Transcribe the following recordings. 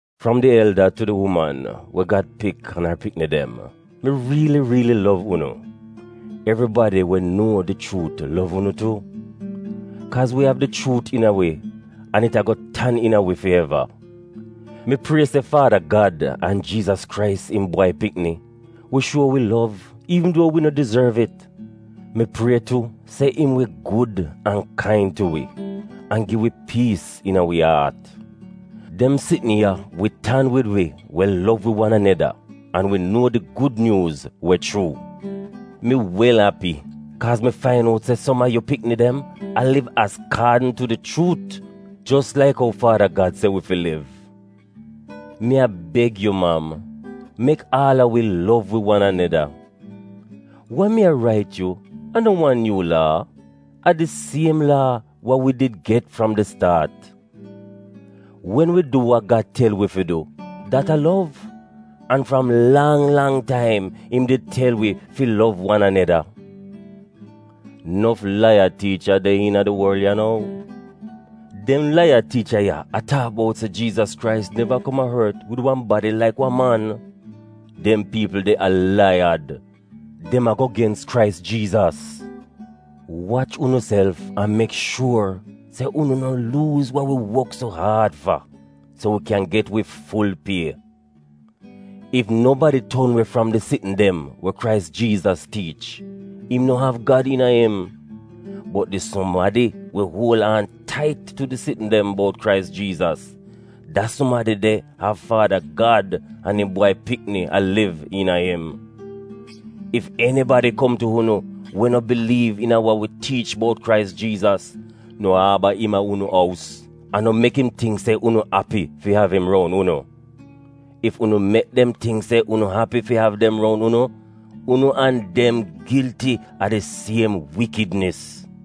Fram di elda tu di uman we Gad pik an ar pikni dem, mi riili riili lov unu. Evribadi we nuo di chuut lov unu tu, kaaz wi av di chuut iina wi an it ago tan iina wi fi eva. Mi prie se Faada Gad an Jiizas Krais, im Bwai Pikni, wi shuo wi lov iivn duo wi no dizorv it. Mi prie tu se im wi gud an kain tu wi, an gi wi piis iina wi aat. Dem sitn ya wi tan wid wi we lov wi wan aneda, an we nuo di Gud Nyuuz we chuu. Mi wel api kaaz mi fain out se som a yu pikni dem a liv azkaadn tu di chuut jos laik ou Faada Gad se wi fi liv. Mi a beg yu mam, mek aal a wi lov wi wan aneda. Wa mi a rait yu a no wan nyuu laa, a di siem laa wa wi did get fram di staat. Wen wi du wa Gad tel wi fi du, dat a lov, an fram lang lang taim im did tel wi fi lov wan aneda. Nof laiyad tiicha de iina di worl ya nou. Dem laiyad tiicha ya a taak buot se Jiizas Krais neva kom a ort wid wan badi laik wan man. Dem piipl de a laiyad. Dem ago gens Krais Jiizas. Wach unuself an mek shuor se unu no luuz wa wi wok so aad fa, so wi kyan get wi ful pie. Ef nobadi ton we fram di sitn dem wa Krais Jiizas tiich, im no av Gad iina im. Bot di sumadi we uol aan tait tu di sitn dem bout Krais Jiizas, da sumadi de av Faada Gad an im Bwai Pikni a liv iina im. Ef enibadi kom tu unu we no biliiv iina wa wi tiich bout Krais Jiizas, no aaba im a unu ous, an no mek im tingk se unu api fi av im roun unu. Ef unu mek dem tingk se unu api fi av dem roun unu, unu an dem gilti a di siem wikidnis.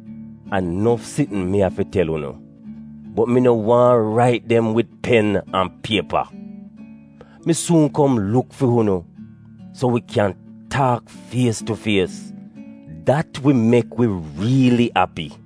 A nof sitn mi av fi tel unu, bot mi no waahn rait dem wid pen an piepa. Mi suun kom luk fi unu so wi kyan taak fies tu fies, dat wi mek wi riili api.